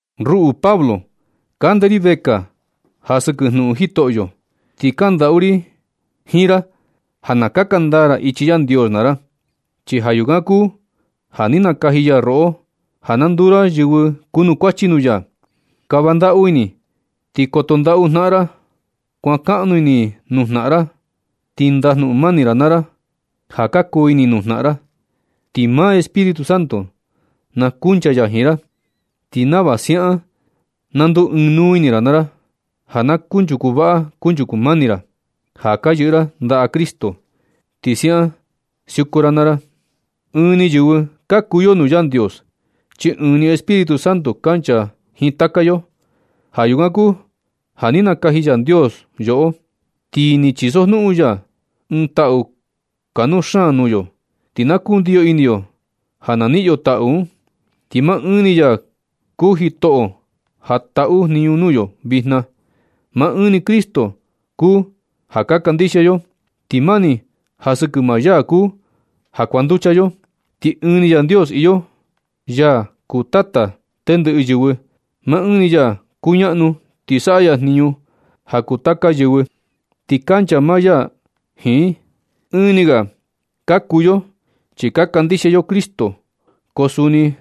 Ruꞌu Pablo kande ri vekaa ja sɨkɨ jnuꞌun Jitoꞌyo. Ti kandaꞌu ri jiin ra ja na kaka ndaa ra ichi Yandios naa ra, chi ja yukan kuu ja ni nakaji ya roꞌo ja na nduu ra yɨvɨ kunukuachi nuu ya. Kava ndaꞌu ini ti koto ndaꞌu jnaꞌan ra. Kuankaꞌnu ini nuu jnaꞌan ra, ti ndajnuꞌun mani naa ra ja ka kuu ini nuu jnaꞌan ra. Ti maa Espíritu Santo na kuncha ya jiin ra, ti nava siaꞌan na nduu ɨɨn nuu ini ra naa ra, ja na kunchuku vaꞌa kunchuku mani ra, ja ka yɨꞌɨ ra ndaꞌa Cristo. Ti siaꞌan siuku naa ra. Ɨɨn ni yɨvɨ ka kuu yo nuu Yandios, chi ɨɨn ni Espíritu Santo kancha jiin taka yo. Ja yukan kuu ja ni nakaji Yandios yoꞌo, ti ni chisojnuꞌun ya ɨɨn taꞌu kanuu xaan nuu yo, ti na kundiyo ini yo ja na niꞌin yo taꞌu un. Ti maa ɨɨn ni ya kuu Jitoꞌo ja taꞌu jniñu nuu yo vijna. Maa ɨɨn ni Cristo kuu ja ka kandixia yo, ti mani ja sɨkɨ maa ya kuu ja kuanducha yo. Ti ɨɨn ni Yandios iyo, ya kuu Tata tendɨꞌɨ yɨvɨ. Maa ɨɨn ni ya kuñaꞌnu ti saꞌa ya jniñu ja kuu taka yɨvɨ, ti kancha maa ya jiin i. Ɨɨn ni ga ka kuu yo chi ka kandixia yo Cristo. Ko suni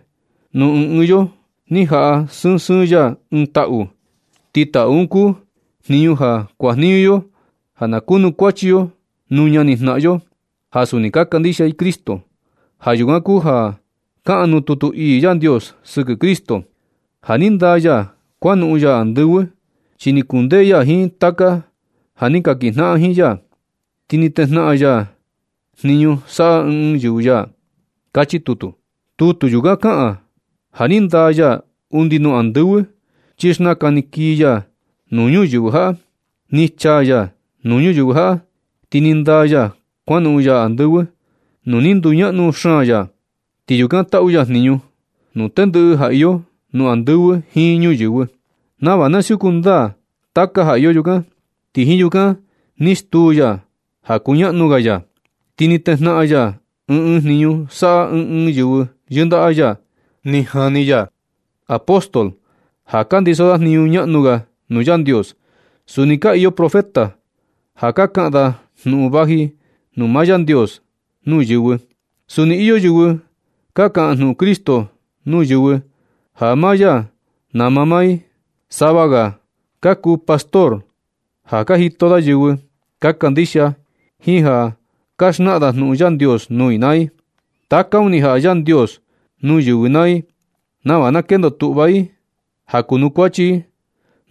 nuu ɨɨn ɨɨn yo ni jaꞌa sɨɨn sɨɨn ya ɨɨn taꞌu, ti taꞌu un kuu jniñu ja kuajniñu yo ja na kunukuachi yo nuu ñani jnaꞌan yo ja suni ka kandixia i Cristo. Ja yukan kuu ja kaꞌan nuu tutu ii Yandios sɨkɨ Cristo: Ja ni ndaa ya kuan noꞌon ya andɨvɨ, chi ni kundee ya jiin taka ja ni ka kinjnaꞌan jiin ya. Ti ni tejnaꞌan ya jniñu saꞌa ɨɨn ɨɨn yɨvɨ ya. Kachi tutu. Tutu yukan kaꞌan ja ni ndaa ya undi nuu andɨvɨ chi xnakan ni kii ya nuu ñuyɨvɨ jaꞌa. Ni chaa ya nuu ñuyɨvɨ jaꞌa, ti ni ndaa ya kuanoꞌon ya andɨvɨ nuu ni nduñaꞌnu xaan ya. Ti yukan taꞌu ya jniñu nuu tendɨꞌɨ ja iyo nuu andɨvɨ jiin ñuyɨvɨ, nava na siuku ndaa taka ja iyo yukan. Ti jiin yukan ni stuu ya ja kuñaꞌnu ga ya. Ti ni tejnaꞌan ya ɨɨn ɨɨn jniñu saꞌa ɨɨn ɨɨn yɨvɨ yɨndaꞌa ya. Ni jani ya apóstol ja ka ndiso da jniñu ñaꞌnu ga nuu Yandios. Suni ka iyo profeta ja na kaꞌan da jnuꞌun vaji nuu maa Yandios nuu yɨvɨ. Suni iyo yɨvɨ ka kaꞌan jnuꞌun Cristo nuu yɨvɨ ja maa ya nama maa i. Sava ga ka kuu pastor ja ka jito da yɨvɨ ka kandixia jiin ja ka xnaꞌan da jnuꞌun Yandios nuu i naa i. Taka un ni jaꞌa Yandios nuu yɨvɨ naa i nava na kendo tuꞌva i ja kunukuachi i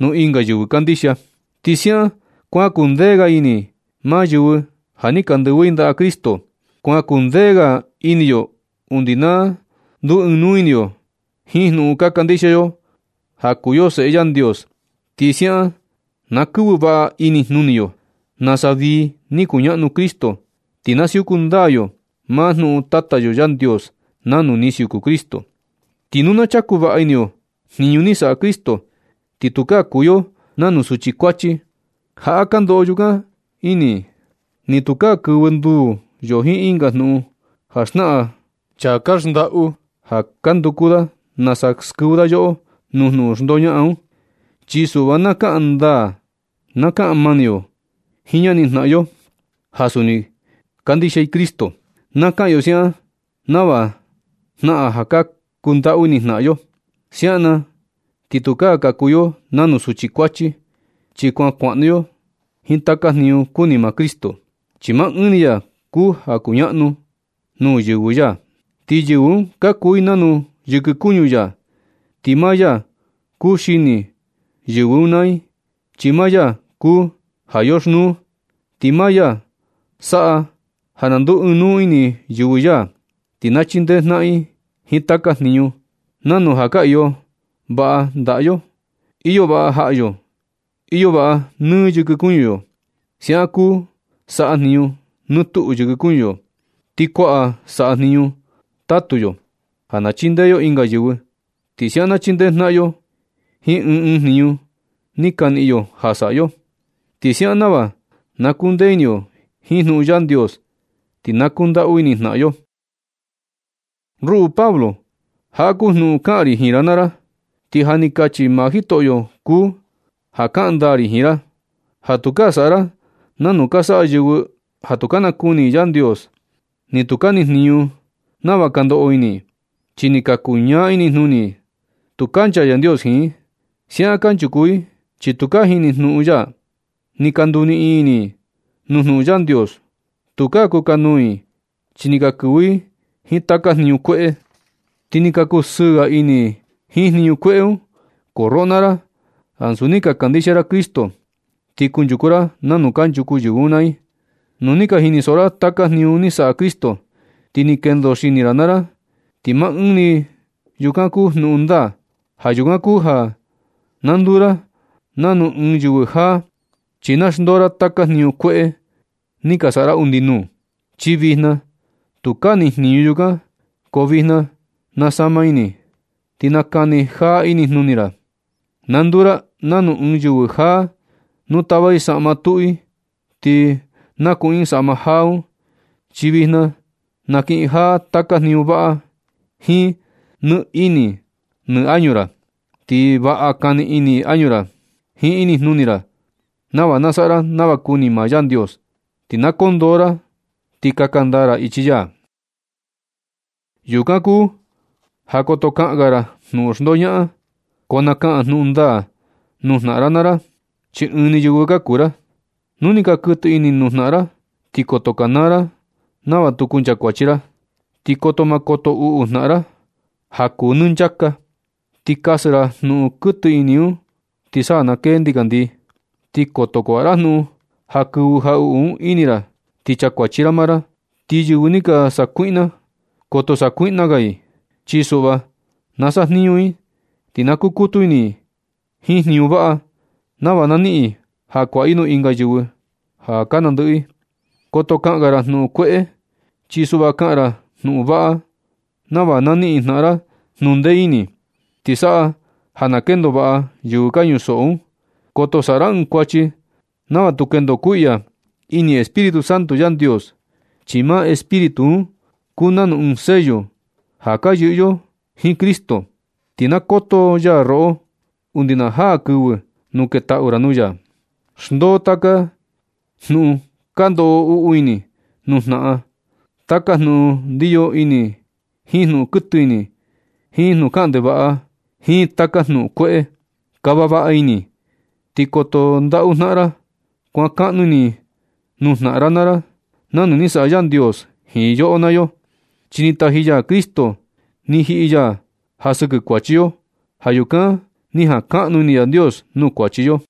nuu ɨnga yɨvɨ kandixia. Ti siaꞌan kuan kuu ndee ga ini maa yɨvɨ ja ni ka ndɨvɨ i ndaꞌa Cristo. Kuan kuu ndee ga ini yo undi na nduu ɨɨn nuu ini yo jiin jnuꞌun ka kandixia yo ja kuu yo Seꞌe Yandios. Ti siaꞌan na kɨvɨ vaꞌa inijnuni yo nasa vii ni kuñaꞌnu Cristo, ti na siuku ndaa yo maa jnuꞌun Tata yo Yandios nanu ni siuku Cristo. Ti nu na chaku vaꞌa ini yo jniñu ni saꞌa Cristo, ti tukaa kuu yo nanu suchi kuachi ja ka ndoꞌo jaꞌa ja ka ndoꞌo yukan ini i. Ni tukaa kɨvɨ nduu yo jiin ɨnga jnuꞌun ja xnaꞌan chaa ka xndaꞌu, ja ka nduku da nasa na skɨvɨ da yoꞌo nuu jnuꞌun xndoñaꞌan un. Chi suꞌva na kaꞌan ndaa na kaꞌan mani yo jiin ñani jnaꞌan yo ja suni kandixia i Cristo. Na kaꞌan yo siaꞌan nava jnaꞌan ja ka kundaꞌu ini jnaꞌan yo. Siaꞌan na ti tukaa ka kuu yo nanu suchi kuachi, chi kuan kuaꞌnu yo jiin taka jniñu kuni maa Cristo, chi maa ɨɨn ni ya kuu ja kuñaꞌnu nuu yɨvɨ ya, ti yɨvɨ un ka kuu i nanu yɨkɨ kuñu ya. Ti maa ya kuu xini yɨvɨ un naa i chi maa ya kuu ja yoxnuu. Ti maa ya saꞌa ja na nduu ɨɨn nuu ini yɨvɨ ya, ti na chindee jnaꞌan i jiin taka jniñu, nanu ja ka iyo vaꞌa ndaꞌa yo, iyo vaꞌa jaꞌa yo iyo vaꞌa nɨ yɨkɨ kuñu yo. Siaꞌan kuu saꞌa jniñu nɨ tuꞌu yɨkɨ kuñu yo. Ti kuaꞌan saꞌa jniñu tatu yo ja na chindee yo ɨnga yɨvɨ. Ti siaꞌan na chindee jnaꞌan yo jiin ɨɨn ɨɨn jniñu ni ka niꞌin yo ja saꞌa yo. Ti siaꞌan nava na kuu ndee ini yo jiin jnuꞌun Yandios, ti na kundaꞌu ini jnaꞌan yo. Ruꞌu Pablo, jaꞌa kuu jnuꞌun kaꞌan ri jiin ra naa ra, ti ja ni kachi maa Jitoꞌo kuu ja kaꞌan ndaa ri jiin ra, ja tukaa saꞌa ra nanu ka saꞌa ɨnga yɨvɨ ja tu ka nakuni i Yandios, ti tu nijniñu nava ka ndoꞌo ini i. Chi ni ka kuñaa inijnuni i. Tu kancha Yandios jiin i. Siaꞌan kanchuku i chi tu ka jini jnuꞌun ya. Ni ka nduniꞌin ini i nuu jnuꞌun Yandios. Tukaa kukanuu i chi ni ka kɨvɨ i jiin taka jniñu kueꞌe. Ti ni ka kusɨɨ ga ini i jiin jniñu kueꞌe un. Ko roꞌo naa ra, ansu ni ka kandixia ra Cristo ti kunchuku ra nanu kanchuku yɨvɨ un naa i. Nu ni ka jinisoꞌo ra taka jniñu ni saꞌa Cristo, ti ni kendo xini ra naa ra. Ti maa ɨɨn ni yukan kuu jnuꞌun ndaa. Ja yukan kuu ja na nduu ra nanu ɨɨn yɨvɨ jaa, chi na xndoo ra taka jniñu kueꞌe ni ka saꞌa ra undi nuu, chi vijna tukaa nijniñu yukan. Ko vijna nasama ini, ti nakani jaa inijnuni ra. Na nduu ra nanu ɨɨn yɨvɨ jaa nu tava i saꞌma tuꞌu ti na kuꞌun i saꞌma jaa un, chi vijna nakiꞌin jaa taka jniñu vaꞌa jiin nɨ ini nɨ añu ra. Ti vaꞌa kani ini añu ra jiin inijnuni ra nava na saꞌa ra nava kuni maa Yandios, ti na koo ndoo ra ti kaka ndaa ra ichi ya. Yukan kuu ja koto kaꞌan ga ra jnuꞌun xndoñaꞌan, ko na kaꞌan jnuꞌun ndaa nuu jnaꞌan naa ra, chi ɨɨn ni yɨvɨ ka kuu ra. Nu ni ka kuɨtɨ ini nuu jnaꞌan ra, ti koto kanaa ra nava tu kuncha kuachi ra. Ti koto ma koto uꞌu jnaꞌan ra ja kuu nɨ nchaka, ti kasɨ ra jnuꞌun kuɨtɨ ini ti sa na kee ndikandii. Ti koto kuaꞌa ra jnuꞌun ja kɨvɨ jaꞌuꞌu un ini ra ti chakuachi ra maa ra. Ti yɨvɨ ni ka sakuiꞌna, koto sakuiꞌna ga i. Chi suꞌva na sajniñu i, ti na kukutu ini i jiin jniñu vaꞌa nava na niꞌin i ja kuaꞌa i nuu ɨnga yɨvɨ ka nandɨꞌɨ. Koto kaꞌan ga ra jnuꞌun kueꞌe, chi suꞌva kaꞌan ra jnuꞌun vaꞌa nava na niꞌin jnaꞌan ra jnundee ini. Ti saꞌa ja na kendo vaꞌa yɨvɨ ka ñusoꞌo un. Koto saꞌa ra ɨɨn kuachi nava tu kendo kuiꞌya ini Espíritu Santo Yandios. Chi maa Espíritu un kuu nanu ɨɨn sello ja ka yɨꞌɨ yo jiin Cristo, ti na koto ya roꞌo undi na jaa kɨvɨ nu ketaꞌu ra nuu ya. Xndoo taka jnuꞌun ka ndoꞌo uꞌu ini nuu jnaꞌan, taka jnuꞌun ndiyo ini jiin jnuꞌun kuɨtɨ ini, jiin jnuꞌun kaꞌan ndevaꞌa, jiin taka jnuꞌun kueꞌe. Kava vaꞌa ini ti koto ndaꞌu jnaꞌan naa ra, kuankaꞌnu ini nuu jnaꞌan naa ra nanu ni saꞌa Yandios jiin yoꞌo naa yo. Chi ni taji ya Cristo ni jiꞌi ya ja sɨkɨ kuachi yo. Ja yukan ni jankaꞌnu ini Yandios nuu kuachi yo.